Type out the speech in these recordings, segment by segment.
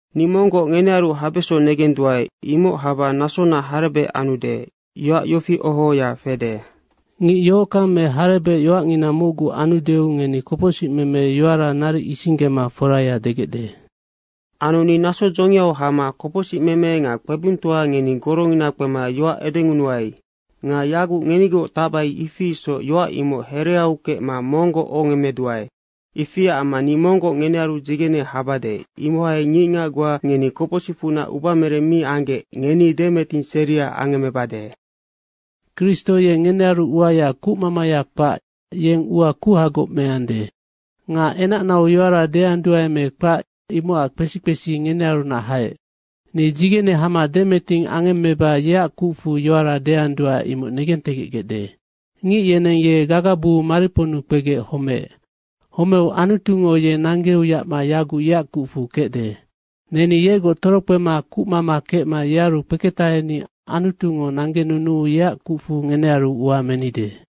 Ni monggoc ngenearu habeso negenduae, imoc haba nasona harebec anude. Yoac yofi oho ohoya fede, “Ngic yohockang me harebec yoacngina mocgu anudeu ngeni kopocsicmeme yoara naric isinggema foraya degecde.” Anu ni naso dzongiau hama kopocsicmeme nga kpebungtoa ngeni gorongina kpema yoac edengunuai. Nga yaguc ngenigoc tacbai ifi isoc yoac imoc hereau kecma monggoc ohongemmeduae. Ifiac amma ni monggoc ngenearu dzigene habade, imohai ngicngac goa ngeni kopocsicfunac ubamereng mi anggec, ngeni demeting seria angemmebade. Kristo ye ngenearu uaya kucmamaya kpac, yeng ua kuhagoc meande. Nga enacnau yoara deanduae me kpac imocac kpesi kpesi ngenearunac haec. Ni dzigene hama demeting angemmeba yeac kucfu yoara deanduae, imoc negentegecgecde. Ngic yeneng ye gagabuu mariponnu kpegec homeec. Homeu Anutungo ye nanggeu yacma yaguc yeac kucfu kecde. Neni yegoc torokpema kucmama kecma yearu kpeketaheni Anutungo nanggenunuu yeac kucfu ngenearu ua menide.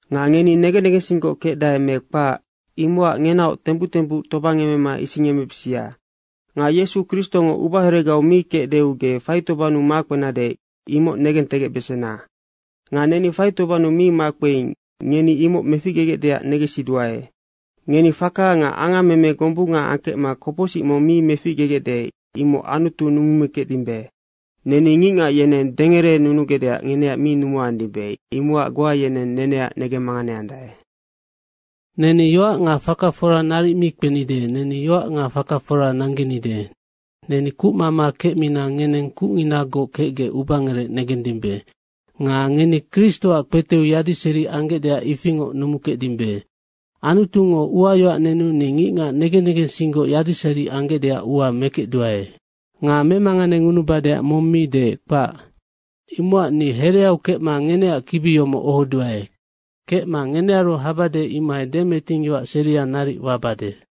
Nga ngeni negen negensinggoc kecdae me kpac, imocac ngenaoc tembuc tembuc tobangemema isingemebisia. Nga Yesu Kristongo ubaheregau mi kecdeu ge faitobannu makpenade, imoc negentegecbesena. Nga neni faitobannu mi makpeing, ngeni imoc meficgegecdeac negensiduae. Ngeni faka nga angammeme gombunga angkecma kopocsic mong mi meficgegecde, imoc Anutu numumikecdimbe. Neni ngicngac yeneng dengerenunugecdeac ngeneac mi numuandimbe, imocac goa yeneng neneac negemmanganeandae. Neni yoac nga faka fora naric mi kpenide, neni yoac nga faka fora nanggenide. Neni kucmama kecmina ngeneng kucnginagoc kecgec ubangerec negendimbe. Nga ngeni Kristoac kpeteu yadiseri anggecdeac ifingoc numukecdimbe. Anutungo uayoac nenu ni ngicngac negen negensinggoc yadiseri anggecdeac ua mekecduae. Nga memanganengunubadeac mong mi deec, kpac. Imocac ni hereau kecma ngeneac kibi yomoc ohoduae. Kecma ngenearu habade, imohai demeting yoac seria naric wabade.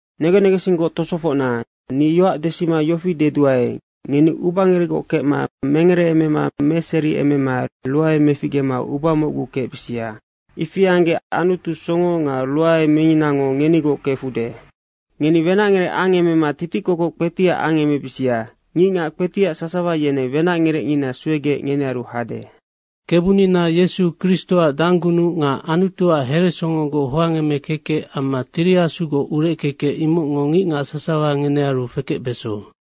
Negen negensinggoc tosofocna, ni yoac desima yofi deduae, ngeni ubangerecgoc kecma mengereemema meseriemema ruae meficgema uba mocgu kecbisia. Ifi anggec Anutu, songo nga ruae minginango, ngenigoc kefude. Ngeni wenacngerec angemema titikokoc kpetiac angemebisia. Ngicngac kpetiac sasawa yeneng wenacngerecngina suegec ngenearu hade. Kebunina Yesu Kristoac danggunuc nga Anutuac heresongogoc hoangemekekec amma Tiri Asugoc ureckekec, imocngo ngicngac sasawa ngenearu fekecbeso.